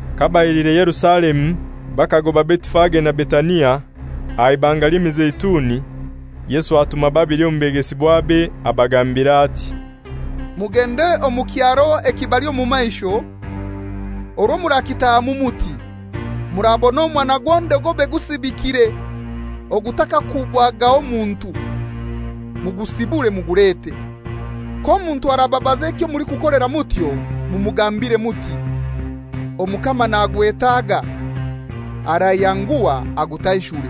Kabailiire haihi na Yerusalemu bakagoba Betifage na Betania, aha Ibanga ly'Emizeituni, Yesu atuma babili omu begesibwabe, abagambira ati, «Mugende omu kyaro ekibali omu maisho, orwo murakitahamu muti, murabona omwana gw'endogobe gusibikire, ogutakakuubwagaho muntu, mugusibure mugulete. K'omuntu arababaza ekyo mulikukolera mutyo, mumugambire muti, ‹Omukama nagwetaga, arayanguha agutaishure.›»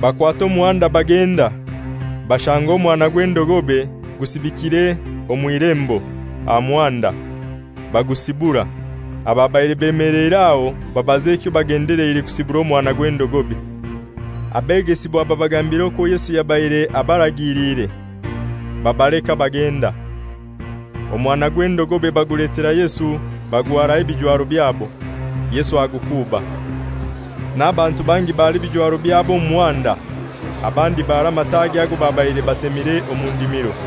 Bakwata omuhanda bagenda, bashanga omwana gw'endogobe gusibikire omw'ilembo aha muhanda; bagusibura. Ababaire beemeleire aho babaza ekyo bagendeleire kusibura omwana gw'endogobe. Abegesibwa babagambira okwo Yesu yabaire abaragiliire; babaleka bagenda. Omwana gw'endogobe baguletera Yesu bagwaraho ebijwaro byabo, Yesu agukuuba. N'abantu bangi bara ebijwaro byabo omu muhanda, abandi bara amatagi ago babaire batemire omu ndimiro.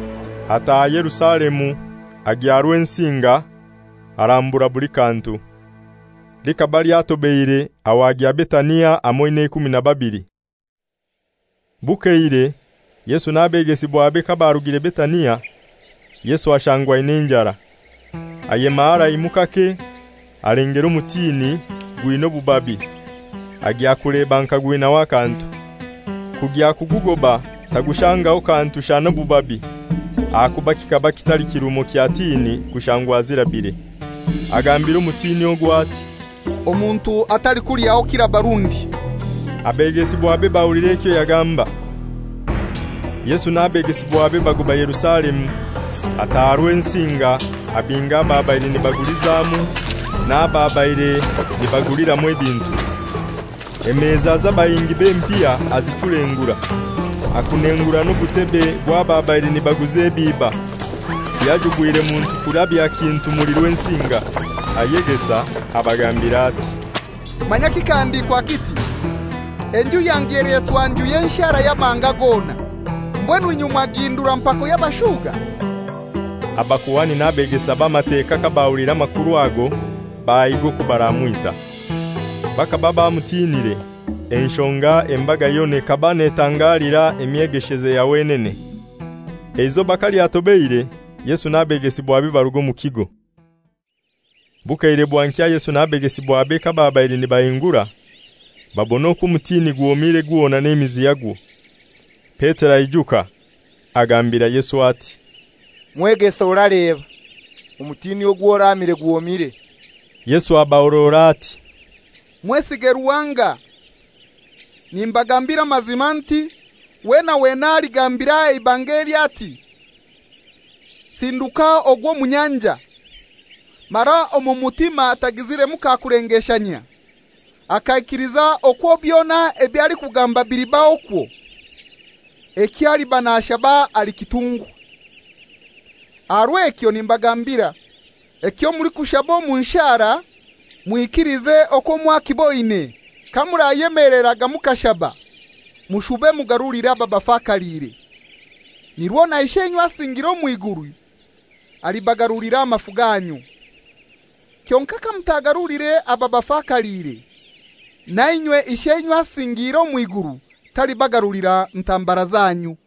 Ataaha Yerusalemu, agya Rwensinga, arambura buli kantu. Likaba lyatobeire, aho agya Betania hamoi n'eikumi na babili. Bukeire Yesu n'abegesibwabe kabarugire Betania, Yesu ashangwa aina enjara. Ayema haraimu kake, alengera omutini gwina obubabi, agya kuleba nka gwinaho akantu. Kugya kugugoba tagushangaho kantu shana obubabi, ahakuba kikaba kitali kirumo kya tini kushangwa zirabire. Agambira omutini ogwo ati, «Omuntu atalikulyaho kiraba rundi.» Abegesibwabe bahulira ekyo yagamba. Yesu n'abegesibwabe bagoba Yerusalemu. Ataha Rwensinga abinga ababaire nibagulizamu n'ababaire nibaguliramu ebintu. Emeza z'abahingi b'empiha azichulengura, akunengura n'obutebe bw'ababaire nibaguza ebiiba. Tiyajubwire muntu kurabya kintu muli Rwensinga. Ayegesa abagambira ati, «Manya kikahandikwa kiti, ‹Enju yange elyetwa nju y'enshara y'amahanga gona.› Mbwenu inywe mwagihindura mpako y'abashuga.» Abakuhani n'abegesa b'Amateka kabahuliire amakuru ago bahiga okwo baramwita. Bakaba bamutinire, enshonga embaga yona ekaba netangalira emyegesheze ya wenene. Eizoba kalyatobeire Yesu n'abegesibwabe baruga omu kigo. Bukeire bwankya Yesu n'abegesibwabe kababaire nibahingura, babona okwo omutini gwomire gwona n'emizi yagwo. Petero aijuka, agambira Yesu ati, «Mwegesa, oraleba! Omutini ogwo oraamire gwomire.» Yesu abahorora ati, «Mwesige Ruhanga. Nimbagambira amazima nti wena wena aligambira eibanga eli ati, ‹Sinduka ogwe omu nyanja,› mara omu mutima atagiziremu kakulengeshanyia, akaikiliza okwo byona ebyo alikugamba bilibahokwo, ekyo aliba nashaba alikitungwa. Aha rw'ekyo nimbagambira, ekyo mulikushaba omu nshara, mwikilize okwo mwakiboine, ekyo mulikitungwa. Kamurayemeleraga mukashaba, mushube mugarulire ababafakaliire; nirwo na Isheinywe asingiire omw'iguru alibagarulira amafu ganyu. [Kyonkai kamutagaruliire babafakaliire, nainywe Isheinywe asingiire omw'iguru talibagarulira ntambara zanyu.]»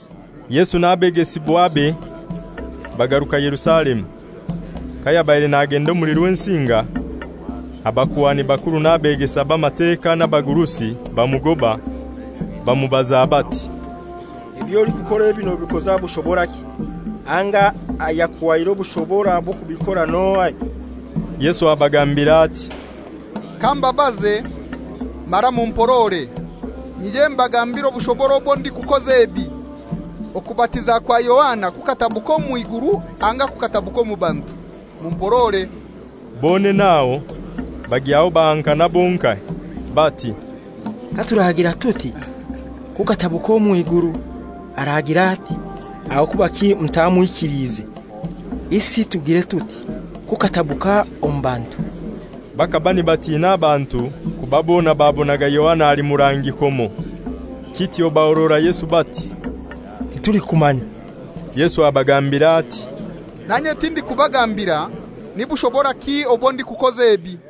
Yesu n'abegesibwabe bagaruka Yerusalemu. Kayabaire nagenda omuli Rwensinga, abakuhani bakuru n'abegesa b'Amateka n'abagurusi bamugoba, bamubaza bati, «Eby'olikukora ebi nobikoza bushoboraki, anga ayakuhaire obushobora bw'okubikora n'ohai?» Yesu abagambira ati, «Kambabaze; mara mumporore, nyije mbagambiire obushobora obwo ndikukoza ebi. Okubatiza kwa Yohana kukatabuka omw'iguru anga kukatabuka omu bantu? Mumporore.» Bonene aho bagyaho bahankana bonkai. Bati, «Katuragira tuti, ‹Kukatabuka omw'iguru,› aragira ati, ‹Aho kubaki mutamwikiliize?› Isi tugire tuti, ‹Kukatabuka omu bantu?›» Bakaba nibatina abantu, kuba bona babonaga Yohana ali murangi komo. Kityo bahorora Yesu bati, «Titulikumanya.» Yesu abagambira ati, «Nanye tindikubagambira ni bushoboraki obwo ndikukoza ebi.»